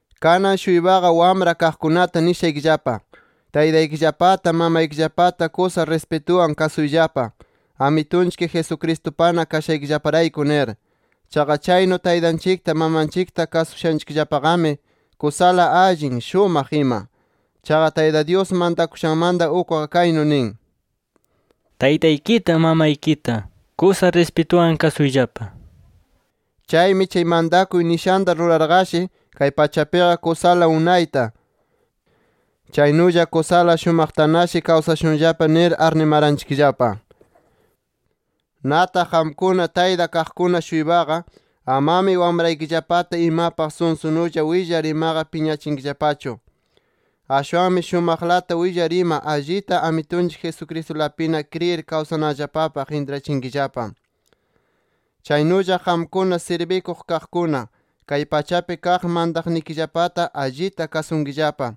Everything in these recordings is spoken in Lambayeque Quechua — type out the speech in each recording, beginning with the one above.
Kanan-shuypaqa wamra kaqkunata nishaykillapa: Taytaykillapata, mamaykillapata kusa rispituwan kasuyllapa, Amitunchik Jesucristupana kashaykillaparayku nir. Chaqa chaynu taytanchikta, mamanchikta kasushanchikllapaqami kusala allin, shumaq ima. Chaqa Tayta Dyus mantakushanmanta ukqa kaynu nin: “Taytaykita, mamaykita kusa rispituwan kasuyllapa” nir. Chaymi chay mantakuy nishanta rurarqashi, kay pachapiqa kusala unayta, chaynulla kusala shumaqtanashi kawsashunllapa nir arnimaranchikllapa. Nataq qamkuna tayta kaqkuna-shuypaqa, amami wamraykillapata imapaq sunsunulla willar imaqa piñachinkillapachu. Ashwanmi shumaqlata willar ima, allita Amitunchik Jesucristulapina kriyir kawsananllapapaq intrachinkillapa. Chaynulla qamkuna sirbikuq kaqkuna, kay pachapi kaq mantaqnikillapata allita kasunkillapa.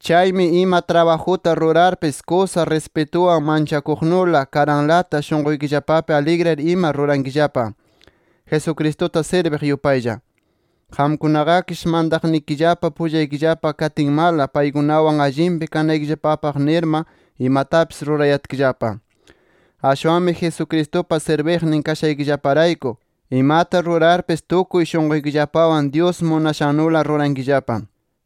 Chaymi ima trabajuta rurarpis kusa rispituwan, manchakuqnula, karanlata, shunquykillapapi aligriyar ima rurankillapa, Jesucristuta sirbiq yupaylla. Qamkunaqakish mantaqnikillapa pullaykillapa katinmala paykunawan allinpi kanaykillapapaq nirma imatapis rurayatkillapa. Ashwanmi Jesucristupa sirbiqnin kashaykillaparayku, imata rurarpis tukuy shunquykillapawan, Dyus munashannula rurankillapa.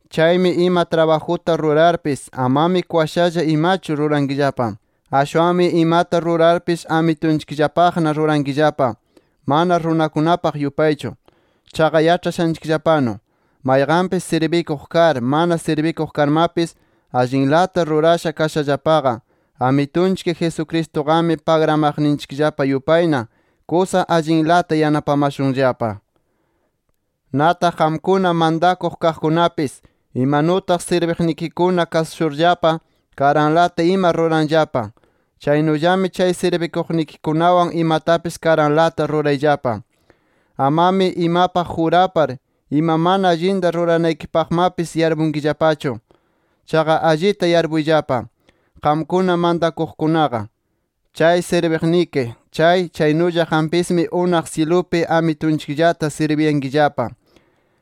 Chaymi ima trabajuta rurarpis, amami kwashalla imachu rurankillapa. Ashwanmi imata rurarpis Amitunchikllapaqna rurankillapa, mana runakunapaq yupaychu. Chaqa yaĉhashanchikllapanu, mayqanpis sirbikuq kar, mana sirbikuq karmapis, allinlata rurasha kashallapaqa, Amitunchik Jesucristuqami pagramaqninchikllapa yupayna, kusa allinlata yanapamashunllapa. Nataq qamkuna mantakuq kaqkunapis, imanutaq sirbiqnikikuna kasushurllapa karanlata ima ruranllapa, chaynullami chay sirbikuqnikikunawan imatapis karanlata rurayllapa. Amami imapaq jurapar, ima mana allinta ruranaykipaqmapis yarpunkillapachu. Chaqa allita yarpuyllapa qamkuna mantakuqkunaqa: Chay sirbiqniki chay, chaynulla qampismi unaq syilupi Amitunchikllata sirbiyankillapa.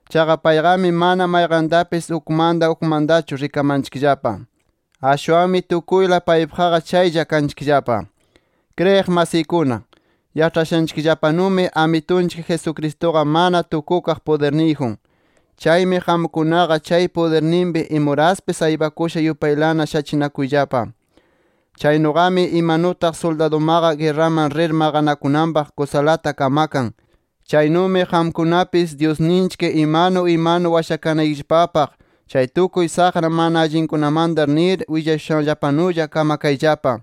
Chaqa payqami, mana mayqantapis ukmanta ukmantachu rikamanchikllapa. Ashwanmi tukuyla paypaqqa chaylla kanchikllapa. Kriyiq masiykuna, yaĉhashanchikllapanumi Amitunchik Jesucristuqa mana tukukaq pudirniyjun. Chaymi qamkunaqa chay pudirninpi imuraspis aypakusha yupaylana shachinakuyllapa. Chaynuqami imanutaq suldadumaqa guerraman rir maqanakunanpaq kusalata kamakan, chaynumi qamkunapis Dyusninchik imanu imanu washakanaykillapaq chay tukuy saqra mana allinkunamanta nir willashushanllapanulla kamakayllapa.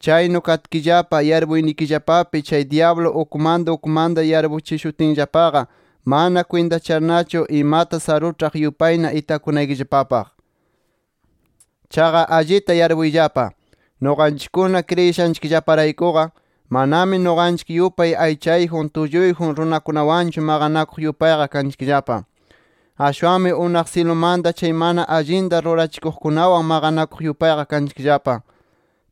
Chaynu katkillapa, yarpuynikillapapi chay dyablu ukmanta ukmanta yarpuchishutinllapaqa, mana kwintacharnachu imata saruĉhaq yupayna itakunaykillapapaq. Chaqa allita yarpuyllapa: Nuqanchikkuna kriyishanchikllaparaykuqa, manami nuqanchik yupay aychayjun, tulluyjun runakunawanchu maqanakuq yupayqa kanchikllapa. Ashwanmi unaq syilumanta chay mana allinta rurachikuqkunawan maqanakuq yupayqa kanchikllapa.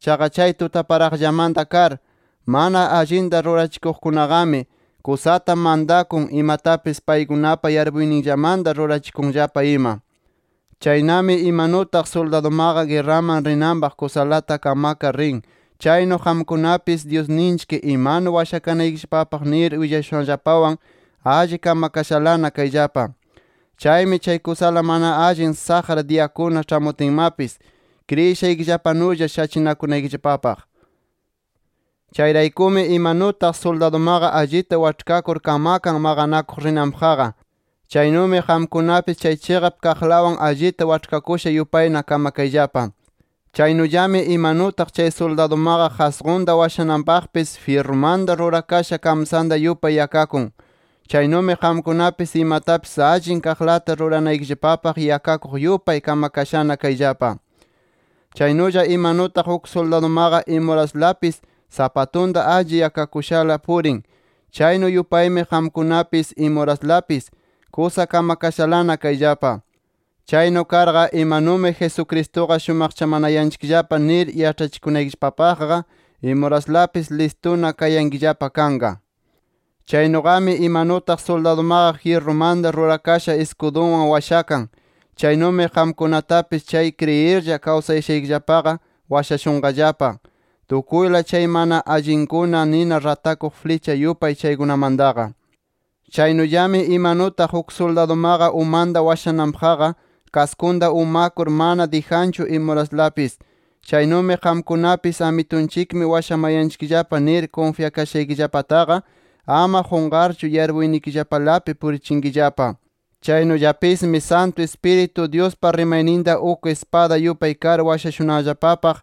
Chaqa chay tutaparaqllamanta kar, mana allinta rurachikuqkunaqami, kusata mantakun, imatapis paykunapa yarpuyninllamanta rurachikunllapa ima. Chaynami imanutaq suldadumaqa guerraman rinanpaq kusalata kamakar rin, chaynu qamkunapis Dyusninchik imanu washakanaykillapapaq nir willashushanllapawan alli kamakashalana kayllapa. Chaymi chay kusala mana allin saqra diyakuna ĉhamutinmapis, kriyishaykillapanulla shachinakunaykillapapaq. Chayraykumi imanutaq suldadumaqa allita waĉhkakur kamakan maqanakuq rinanpaqqa, chaynumi qamkunapis chay chiqap kaqlawan allita waĉhkakusha yupayna kamakayllapa. Chaynullami imanutaq chay suldadumaqa qasqunta washananpaqpis jyirrumanta rurakasha kamsanta yupay yakakun, chaynumi qamkunapis imatapis allin kaqlata ruranaykillapapaq yakakuq yupay kamakashana kayllapa. Chaynulla imanutaq uk suldadumaqa imuraslapis sapatunta alli yakakushala purin, chaynu yupaymi qamkunapis imuraslapis kusa kamakashalana kayllapa. Chaynu karqa imanumi Jesucristuqa shumaqchamanayanchikllapa nir yaĉhachikunaykillapapaqqa imuraslapis listuna kayankillapa kanqa. Chaynuqami imanutaq suldadumaqa jyirrumanta rurakasha iskudunwan washakan, chaynumi qamkunatapis chay kriyirlla kawsashaykillapaqa washashunqallapa, tukuyla chay mana allinkuna nina ratakuq flicha yupay chaykunamantaqa. Chaynullami imanutaq uk suldadumaqa umanta washananpaqqa kaskunta umakur mana dijanchu imuraslapis, chaynumi qamkunapis Amitunchikmi washamayanchikllapa nir kunfyakashaykillapataqa ama qunqarchu yarpuynikillapalapi purichinkillapa. Chaynullapismi Santu Ispiritu Dyuspa rimayninta uk ispada yupay kar washashunanllapapaq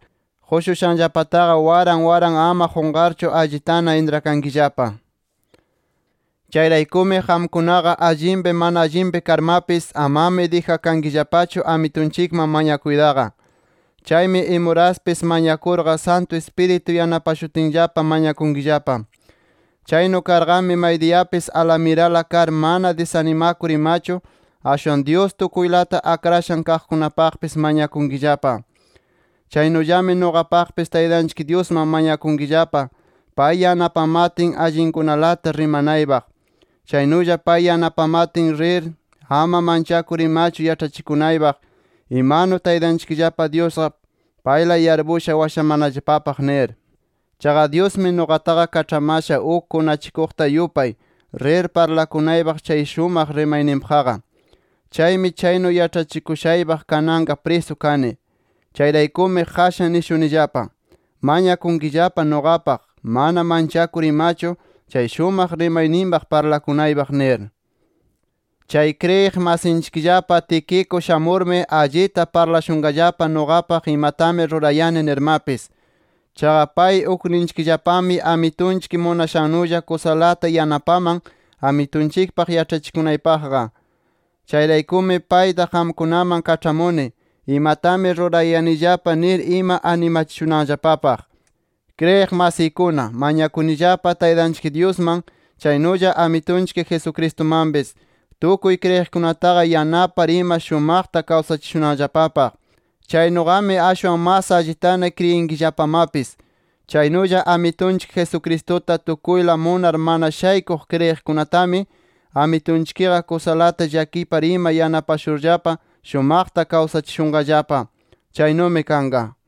qushushanllapataqa waran waran ama qunqarchu allitana intrakankillapa. Chayraykumi qamkunaqa allinpi mana allinpi karmapis amami dijankillapachu Amitunchikman mañakuytaqa. Chaymi imuraspis mañakurqa, Santu Ispiritu yanapashutinllapa mañakunkillapa. Chaynu karqami, maydiyapis alamirala kar, mana disanimakur imachu, ashwan Dyus tukuylata akrashan kaqkunapaqpis mañakunkillapa. Chaynullami nuqapaqpis Taytanchik Dyusman mañakunkillapa, pay yanapamatin allinkunalata rimanaypaq. Chaynulla pay yanapamatin, rir ama manchakur imachu yaĉhachikunaypaq imanu Taytanchikllapa Dyusqa payla yarpusha washamanallapapaq nir. Chaqa Dyusmi nuqataqa kaĉhamasha uk kunachikuqta yupay, rir parlakunaypaq chay shumaq rimayninpaqqa. Chaymi chaynu yaĉhachikushaypaq kananqa prisu kani. Chayraykumi qashan nishunillapa: Mañakunkillapa nuqapaq mana manchakur imachu, chay shumaq rimayninpaq parlakunaypaq nir. Chay kriyiq masinchikllapa Tíquico shamurmi, allita parlashunqallapa nuqapaq imatami rurayani nirmapis. Chaqa pay ukninchikllapami, Amitunchik munashannulla kusalata yanapaman Amitunchikpaq yaĉhachikunayllapapaqqa. Chayraykumi payta qamkunaman kaĉhamuni, imatami rurayanillapa nir ima animachishunanllapapaq. Kriyiq masiykuna, mañakunillapa Taytanchik Dyusman, chaynulla Amitunchik Jesucristumanpis, tukuy kriyiqkunataqa yanapar ima shumaqta kawsachishunanllapapaq. Chaynuqami ashwan mas allitana kriyinkillapamapis. Chaynulla Amitunchik Jesucristuta tukuyla munar mana shaykuq kriyiqkunatami, Amitunchikqa kusalata llakipar ima yanapashurllapa shumaqta kawsachishunqallapa. Chaynumi kanqa.